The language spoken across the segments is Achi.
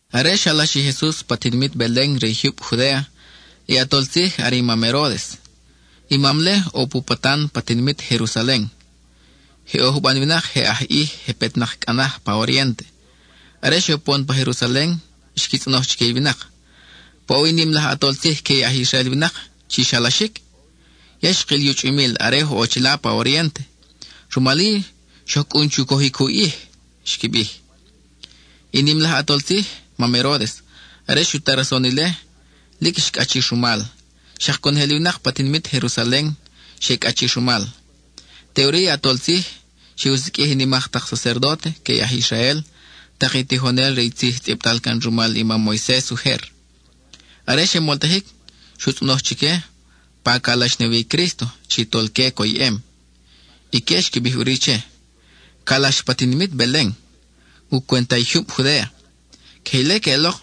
Are xalax i Jesus pa tinimit Belen re i jyub Judéa, i ʼatol tzij are i mam Heródes. I mam-le ʼo pu patan pa tinimit Jerusalen; je ʼo juban winak je aj ʼij, je petnak cʼa naj pa oriénte. Are xe upon pa Jerusalen, xqui tzʼonoj chique i winak: —¿Paʼowi i nim laj ʼatol tzij que i aj Israel winak chi xalaxic? Ya xkil i u chʼumil are oj ʼo chila pa oriénte, rumal-i xoj cʼun chu cojic u ʼij —xqui bij. I nim laj ʼatol tzij, mam Heródes, are xu ta rason ile, lic xcʼachir rumal; xak conojel i winak pa tinimit Jerusalen xe cʼachir rumal. Teʼuri i ʼatol tzij xe u siqʼuij i nimak tak sacerdóte que i aj Israel, tak i tijonel re i tzij tzʼibtal can rumal i mam Moises ujer. Are xe moltajic, xu tzʼonoj chique pa calax na wi i Crísto chi tolque coyʼem. Ique xqui bij ʼuri che: —Calax pa tinimit Belen, u cwenta i jyub Judéa. Queje ile queʼelok,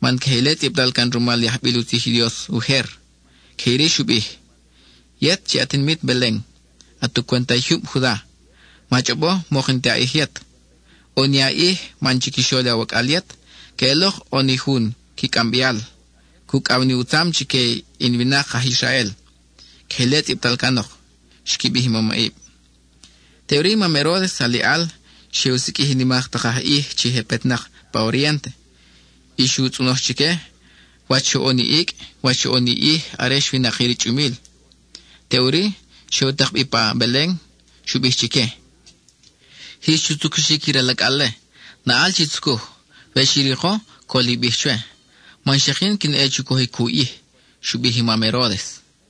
man queje ile tzʼibtal can rumal i ajbil u tzij i Dios ujer. Queje iri xu bij: Yet chi at tinimit Belen, at u cwenta i jyub Juda, ma chʼobo mok n-ti a ʼij yet; ʼo ni a ʼij man chiquixol awacʼal yet queʼelok ʼo ni jun qui cʼambeal; cucʼaw ni u tzam chique in winak, aj Israel. Queje ile tzʼibtal canok —xqui bij i mamʼib. Teʼuri i mam Heródes aliʼal xe u siqʼuij i nimak tak aj ʼij chi je petnak pa oriénte y xu tzʼonoj chique wach xoʼon i icʼ, wach xoʼon i ʼij are xwinakir i chʼumil. Teʼuri, xe u takbi pa Belen. Xu bij chique: —Jix chu tzucuxic i ral acʼal-le; naʼal chi tzucuj. We xi riko, col i bij chwe, man xak yin quin ʼe chu cojic u ʼij —xu bij i mam Heródes.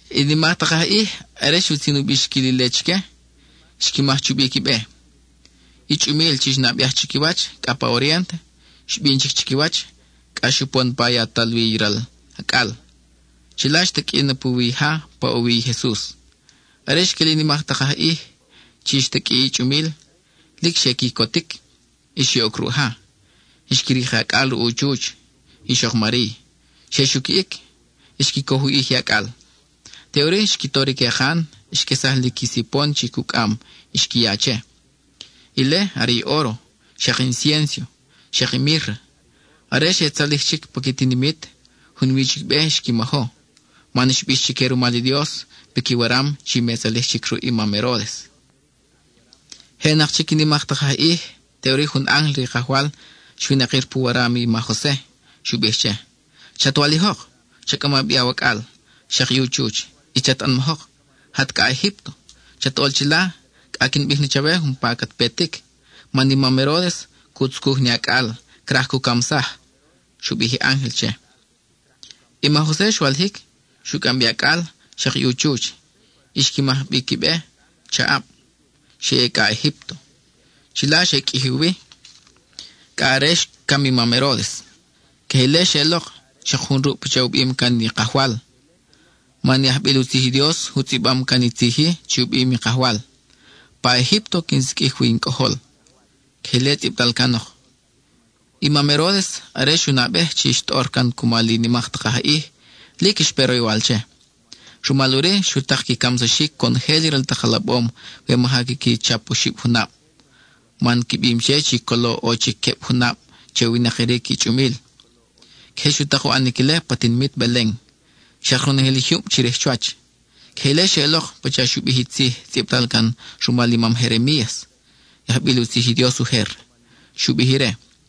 I nimak tak aj ʼij, are xutzin u bixquil ile chique, xqui maj chubi qui be. I chʼumil chi xnabeaj chiquiwach cʼa pa oriénte, xbin chic chiquiwach cʼa xupon pa yatal wi i ral acʼal. Chila xtaqʼui na puwi i ja paʼowi i Jesus. Are xquil i nimak tak aj ʼij chi xtaqʼui i chʼumil, lic xe quicotic. Y xe ʼoc ruʼ ja, xqui rik i acʼal ruʼ u chuch, ixok Mariy, xe xuquiʼic, xqui coj u ʼij i acʼal. Teʼuri, xqui tor i quekan, xquesaj li qui sipon chi cucʼam y xqui ya che. Ile are óro, xak inciénso, xak i mírra. Are xe tzalij chic pa qui tinimit, junwi chic be xqui majo man xbix chique rumal i Dios piqui waram chi me tzalij chic ruʼ i mam Heródes. Je ʼenak chic i nimak tak aj ʼij, teʼuri jun ángel re i Kajwal xwinakir pu waram i ma Jose. Xu bij che: —Chat walijok, cha cʼama bi awacʼal, xak i u chuch, y chat ʼanmajok, jat cʼa Egípto. Chat ʼol chila cʼa quin bij na chawe umpa cat petic, man i mam Heródes cu tzucuj ni acʼal, craj cu camsaj —xu bij i ángel che. I ma Jose xwalijic, xu cʼambi i acʼal, xak i u chuch, y xqui majbi qui be chaʼab, xe ʼe cʼa pa Egípto. Chila xe qʼuiji wi cʼa are xcam i mam Heródes. Queje ile xeʼelok xak jun ruʼ pacha u bim can i Kajwal; man i ajbil u tzij i Dios u tzʼibam can i tzij-i chi u bim i Kajwal: “Pa Egípto quin siqʼuij wi in Cʼojol.” (Queje ile tzʼibtal canok.) I mam Heródes, are xu nabej chi xtʼor can cumal i nimak tak aj ʼij, lic xpe roywal che. Rumal ʼuri, xu tak qui camsaxic conojel i ral tak alabom we maja quiqui chap oxib junab, man qui bim che chi colo ʼo chic queb junab che u winakiric i chʼumil. Queje xu tak u ʼanic ile pa tinimit Belen, xak ronojel i jyub chirij chuwach. Queje ile xeʼelok pacha xu bij i tzij tzʼibtal can rumal i mam Jeremías, i ajbil u tzij i Dios ujer. Xu bij ire: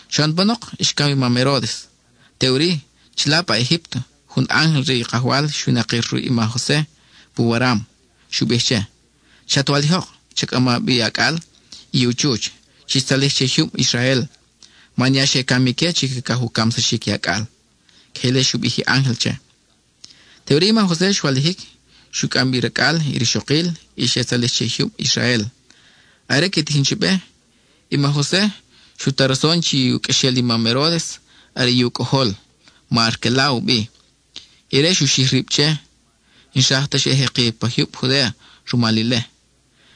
Xoʼon panok xcam i mam Heródes. Teʼuri, chila pa Egípto, jun ángel re i Kajwal xwinakir ruʼ i ma Jose pu waram. Xu bij che: —Chat walijok, cha cʼama bi acʼal y u chuch, chix tzalij che i jyub Israel; man ya xe cam ique chi cacaj u camsaxic i acʼal. (Queje ile xu bij i ángel che.) Teʼuri i ma Jose xwalijic, xu cʼam bi racʼal, i rixokil y xe tzalij che i jyub Israel. Are que tijin chi be, i ma Jose xu ta rason chi u qʼuexel i mam Heródes are i u cʼojol, ma Arqueláo u bi. Ire xu xij rib che, n-xraj ta xa ʼe jeki pa jyub Judéa rumal.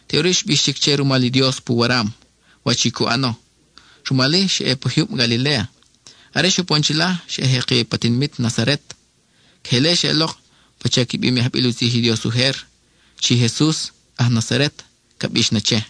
Teʼuri xbix chic che rumal i Dios pu waram wach i cu ʼano; rumal-i, xa ʼe pa jyub Galiléa. Are xe upon chila, xa ʼe jeki pa tinimit Nazaret. Queje ile xeʼelok, pacha qui bim i ajbil u tzij i Dios ujer, chi Jesus “aj Nazaret” ca bix na che.